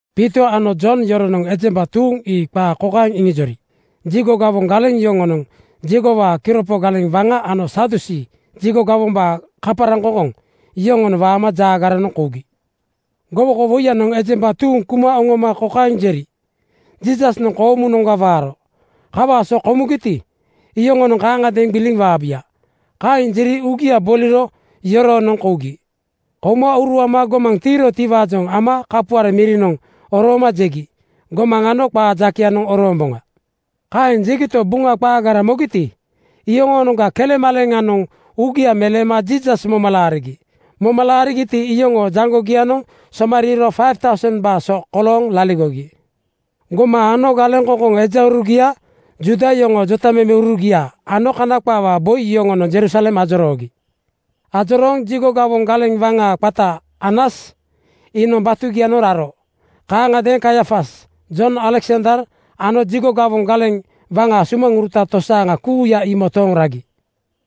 Piito ano Jon yoronoŋ ejemba tuuŋ ii qaa kaeŋ iŋijori jigo gawoŋ galeŋ yoŋonoŋ, jigowaa kiropo galeŋ waŋa ano Sadusii (Jigo gawombaa kaparaŋkoŋkoŋ) yoŋonoŋ waama jaagaranoŋ kougi. Gowokowoiyanoŋ ejemba tuuŋ kuma oŋoma kokaeŋ jeri, “Jiisasnoŋ koomunoŋga waaro. Kawaa so komugiti, iyoŋonoŋ kaaŋadeeŋ gbiliŋ waabuya.” Kaeŋ jeri uugia boliro yoroonoŋ kougi. Kouma uruama gomaŋ tiirotiwaajoŋ ama kapuare mirinoŋ orooma jegi, “Gomaŋ anogo qaa jakeyanoŋ oroomboŋa.” Kaeŋ jegito, Buŋa qaagara mogiti, iyoŋoonoŋga kelemaleleŋanoŋ uugia meleema Jiisas moma laarigi. Moma laarigiti, iyoŋoo jaŋgogianoŋ somariiro 5,000:baa so kolooŋ laligogi. Gomaŋ ano galeŋkoŋkoŋ ejaurugia, Juuda yoŋoo jetamemeurugia ano Kana qaawaa boi yoŋonoŋ Jerusalem ajoroogi. Ajorooŋ jigo gawoŋ galeŋ waŋa qata Anas iinoŋ batugianoŋ raro. Kaaŋagadeeŋ Kaiafas, Jon, Aleksander ano jigo gawoŋ galeŋ waŋaa sumaŋuruta tosaaŋa kuuya ii motooŋ ragi.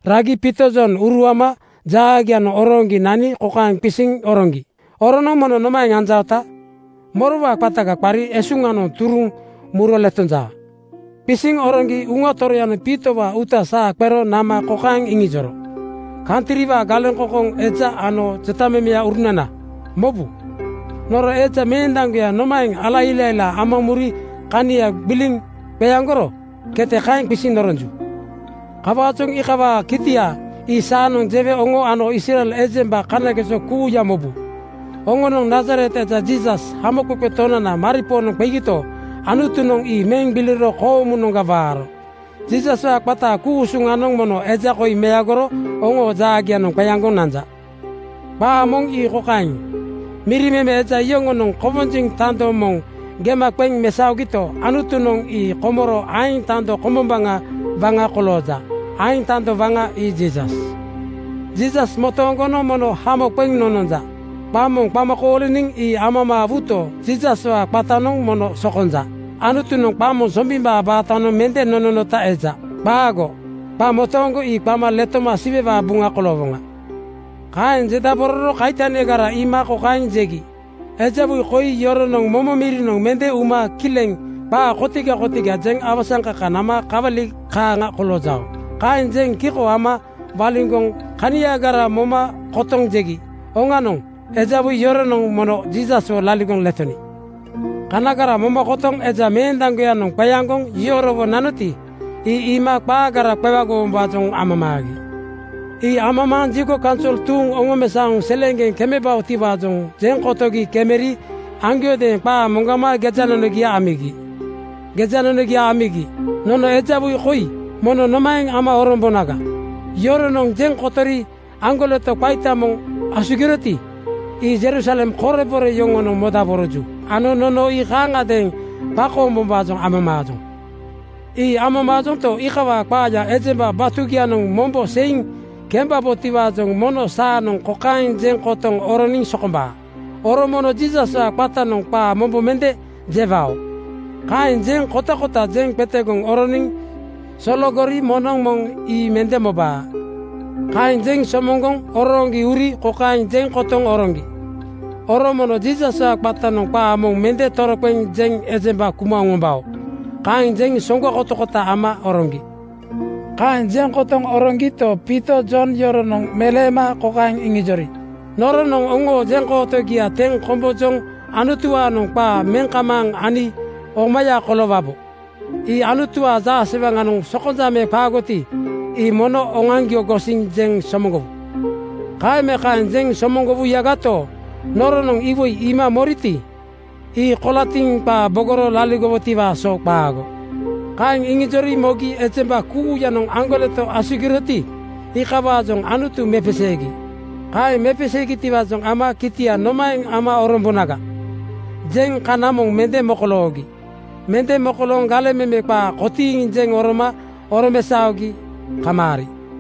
Ragi Piito Jon uruama jaagianoŋ orooŋgi nani kokaeŋ qisiŋ oroŋgi, “Oronoŋ mono nomaeŋ anjaota? Morowaa qataga qari esuŋanoŋ turuŋ muro letonjaa?” Qisiŋ oroŋgi Uŋa Toroyanoŋ Piitowaa uuta saa qero nama kokaeŋ iŋijoro, “Kantriwaa galeŋkoŋkoŋ eja ano jotamemeurunana, mobu. Noro eja meendaŋgoya nomaeŋ ala ilailaa ama muri kania gbiliŋ qeaŋgoro, kete kaeŋ qisiŋ noronju. Kawaajoŋ iikawaa kitia ii saanoŋ jewe oŋo ano Israel ejemba kanageso kuuya mobu. Oŋonoŋ Nazaret eja Jiisas, Hamoqeqe Tonana maripoonoŋ qegito, Anutunoŋ ii meŋ gbiliro koomunoŋga waaro. Jiisaswaa qataa ku-usuŋanoŋ mono eja koi meagoro oŋoo jaagianoŋ qeaŋgoŋ nanja. Qaa moŋ ii kokaeŋ, ‘Miri meme eja yoŋonoŋ kowonjiŋ tando moŋ gema qeŋ mesaogito, Anutunoŋ ii komoro aeŋ tando kombombaŋa waŋa kolooja.’ Aeŋ tando waŋa ii Jiisas. “Jiisas motooŋgonoŋ mono hamo qeŋ nononja. Qa moŋ qama kooliniŋ ii amamaawuto, Jiisaswaa qatanoŋ mono sokonja. Anutunoŋ qa moŋ Sombimbaa baatanoŋ mende nononota eja. Qaago! Qa motooŋgo ii qama letoma Siwewaa buŋa koloowoŋa.” Kaeŋ jendabororo kaitanigara iima kokaeŋ jegi, “Eja woi koi yoronoŋ momo mirinoŋ mende uma kileŋ qaa kotiga kotiga jeŋ awasaŋkaka nama kawali kaaŋa koloojao.” Kaeŋ jeŋ kiko ama waliŋgoŋ kaniagara moma kotoŋ jegi, “Oŋanoŋ! Eja woi yoronoŋ mono Jiisaswo laligoŋ letoni.” Kanagara moma kotoŋ eja meendaŋgoyanoŋ qeaŋgoŋ yorowo nanoti, ii iima qaagara qewagowombaajoŋ amamaagi. Ii amamaaŋ jigo kaunsol tuuŋ oŋomesaoŋ seleeŋgeŋ kemebaotiwaajoŋ jeŋ kotogi kemeri aŋgiodeeŋ qaa moŋgama gejanonogia amigi. Gejanonogia amigi, “Nono eja woi koi mono nomaeŋ ama orombonaga? Yoronoŋ jeŋ kotori aŋgoleto qaita moŋ asugiroti, ii Jerusalem korebore yoŋonoŋ modaboroju ano nono ii kaaŋagadeeŋ qakoombombaajoŋ amamaajoŋ. Ii amamaajonto, iikawaa qaaya ejemba batugianoŋ mombo seiŋ kembabotiwaajoŋ mono saanoŋ kokaeŋ jeŋ kotoŋ oroniŋ sokombaa, ‘Oro mono Jiisaswaa qatanoŋ qaa mombo mende jewao.’ Kaeŋ jeŋ kotakota jeŋ qetegoŋ oroniŋ sologori moŋnoŋ moŋ ii mende mobaa.” Kaeŋ jeŋ somoŋgoŋ orooŋgi uri kokaeŋ jeŋ kotoŋ oroŋgi, “Oro mono Jiisaswaa qatanoŋ qaa moŋ mende toroqeŋ jeŋ ejemba kuma oŋombao.” Kaeŋ jeŋ soŋgo kotakota ama oroŋgi. Kaeŋ jeŋ kotoŋ oroŋgito, Piito Jon yoronoŋ meleema kokaeŋ iŋijori, “Noronoŋ oŋoo jeŋkootogia teŋ kombojoŋ Anutuwaanoŋ qaa meŋ kamaaŋ ani omaya koloowabo. Ii Anutuwaa jaasewaŋanoŋ sokonja me qaagoti, ii mono oŋoaŋgio gosiŋ jeŋ somoŋgowu. Kaeŋ me kaeŋ jeŋ somoŋgowuyagato, noronoŋ iwoi iima moriti, ii kolatiŋ qaa bogoro laligowotiwaa so qaago.” Kaeŋ iŋijori mogi ejemba kuuyanoŋ aŋgoleto asugiroti, iikawaajoŋ Anutu mepeseegi. Kaeŋ mepeseegitiwaajoŋ ama “Kitia nomaeŋ ama orombonaga?” jeŋ kana moŋ mende mokoloogi. Mende mokolooŋ galeŋ meme qaa kotiiŋ jeŋ oroma oromesaogi kamaari.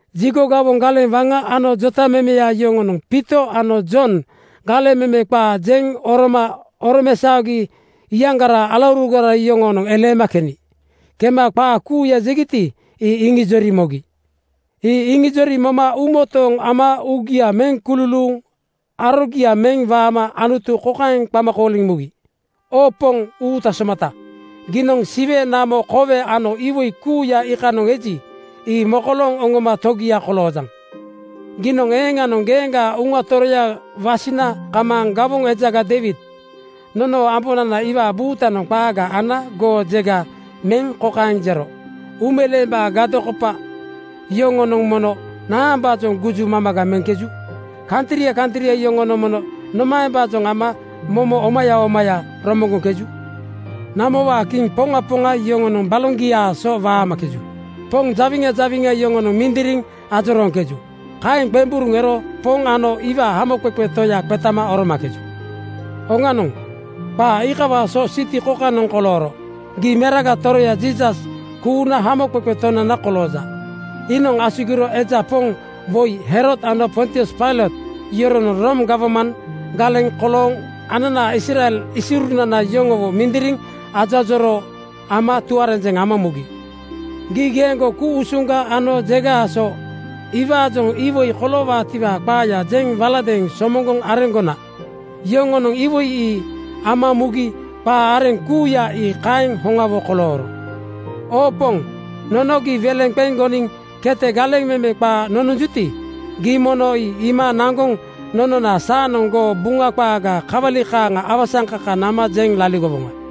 Jigo gawoŋ galeŋ waŋa ano jotamemeya yoŋonoŋ Piito ano Jon galeŋ meme qaa jeŋ oroma oromesaogi iyaŋgaraa alaurugara yoŋoonoŋ eleema keni. Kema qaa kuuya jegiti, ii iŋijori mogi. Ii iŋijori moma uumotooŋ ama uugia meŋ kululuuŋ arogia meŋ waama Anutu kokaeŋ qama kooliŋ mugi, “Oo Poŋ uuta somata, giinoŋ Siwe, namo, kowe ano iwoi kuuya iikanoŋ eji, ii mokolooŋ oŋoma Togia koloojaŋ. Giinoŋ eeŋanoŋ geeŋgaa Uŋa Toroya wasina kamaaŋ gawoŋ ejaga Deiwid, nonoo ambonana iwaa buutanoŋ qaaga ana goo jega meŋ kokaeŋ jero, ‘Uumeleembaa gadokopa yoŋonoŋ mono naambaajoŋ guju mamaga meŋkeju? Kantria kantria yoŋonoŋ mono nomaembaajoŋ ama momo omaya omaya romoŋgoŋkeju? Namowaa kiŋ poŋa poŋa yoŋonoŋ baloŋgiaa so waamakeju. Poŋ jawiŋa jawiŋa yoŋonoŋ mindiriŋ ajorooŋkeju. Kaeŋ qemburuŋ ero Poŋ ano iwaa Hamoqeqe Toya qetama oromakeju.’ Oŋanoŋ, qaa iikawaa so siti kokanoŋ kolooro. Gii Meraga Toroya Jiisas kuuna Hamoqeqe Tonana kolooja. Iinoŋ asugiro eja poŋ woi Herod ano Pontius Pailot yoronoŋ Room gawman galeŋ kolooŋ ananaa Israel isiurunana yoŋowo mindiriŋ ajoajoroo ama tuarenjeŋ ama mugi. Gii geeŋgo ku-usuŋga ano jegaa so iwaajoŋ iwoi koloowaatiwaa qaaya jeŋ waladeeŋ somoŋgoŋ areŋgona. Yoŋonoŋ iwoi ii ama mugi qaa areŋ kuuya ii kaeŋ hoŋawo kolooro. “Oo Poŋ, nono gii weleŋ qeŋ goniŋ kete galeŋ meme qaa nononjuti, gii mono ii iima naŋgoŋ nonona saanoŋ goo Buŋa qaaga kawali kaaŋa awasaŋkaka nama jeŋ laligowoŋa.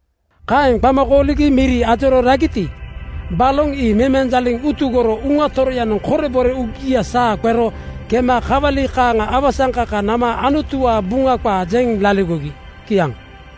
Kaeŋ qama kooligi miri ajorooŋ ragiti, baloŋ ii memenjaliŋ utugoro Uŋa Toroyanoŋ korebore uugia saa qero kema kawali kaaŋa awasaŋkaka nama Anutuwaa Buŋa qaa jeŋ laligogi. Kiaŋ.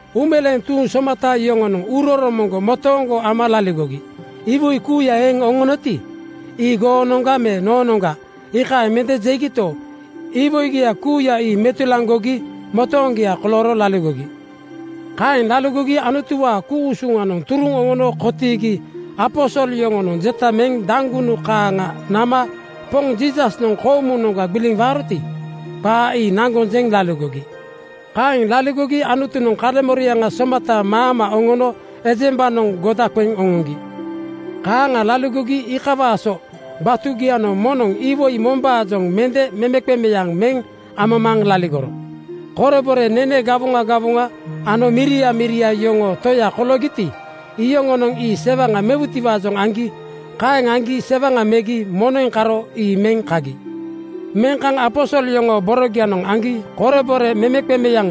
Uumeleeŋ tuuŋ somata yoŋonoŋ uuroromoŋgo motooŋgo ama laligogi. Iwoi kuuya eŋ oŋonoti, ii goonoŋga me noonoŋga, iikaeŋ mende jegito, iwoigia kuuya ii metulaŋgogi motooŋgia kolooro laligogi. Kaeŋ laligogi Anutuwaa ku-usuŋanoŋ turuŋ oŋono kotiigi aposol yoŋonoŋ jeta meŋ daŋgunu kaaŋa nama Poŋ Jiisasnoŋ koomunoŋga gbiliŋ waaroti, qaa ii naŋgoŋ jeŋ laligogi. Kaeŋ laligogi Anutunoŋ kaleŋmoriaŋa somata maama oŋono ejembanoŋ goda qeŋ oŋoŋgi. Kaaŋa laligogi iikawaa so batugianoŋ moŋnoŋ iwoi mombaajoŋ mende memeqemeaŋ meŋ amamaaŋ laligoro. Korebore nene gawoŋa gawoŋa ano miria miria yoŋoo toya koloogiti, iyoŋonoŋ ii sewaŋa mewutiwaajoŋ aŋgi. Kaeŋ aŋgi sewaŋa megi moneŋ karo ii meŋ kagi. Meŋ kaŋ aposol yoŋoo borogianoŋ aŋgi korebore memeqemeaŋ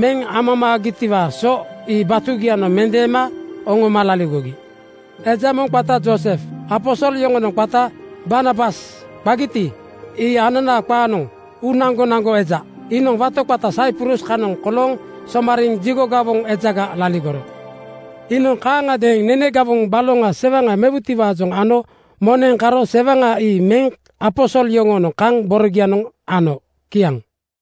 meŋ amamaagitiwaa so ii batugianoŋ mendeema oŋoma laligogi. Eja moŋ qata Joosef, aposol yoŋonoŋ qata Barnabas qagiti, ii ananaa qaanoŋ: Uu-naŋgonaŋgo eja, iinoŋ wato qata Saiprus kanoŋ kolooŋ somariiŋ jigo gawoŋ ejaga (Liwait) laligoro. Iinoŋ kaaŋagadeeŋ nene gawoŋ baloŋa sewaŋa mewutiwaajoŋ ano moneŋ karo sewaŋa ii meŋ aposol yoŋoonoŋ kaŋ borogianoŋ ano. Kiaŋ.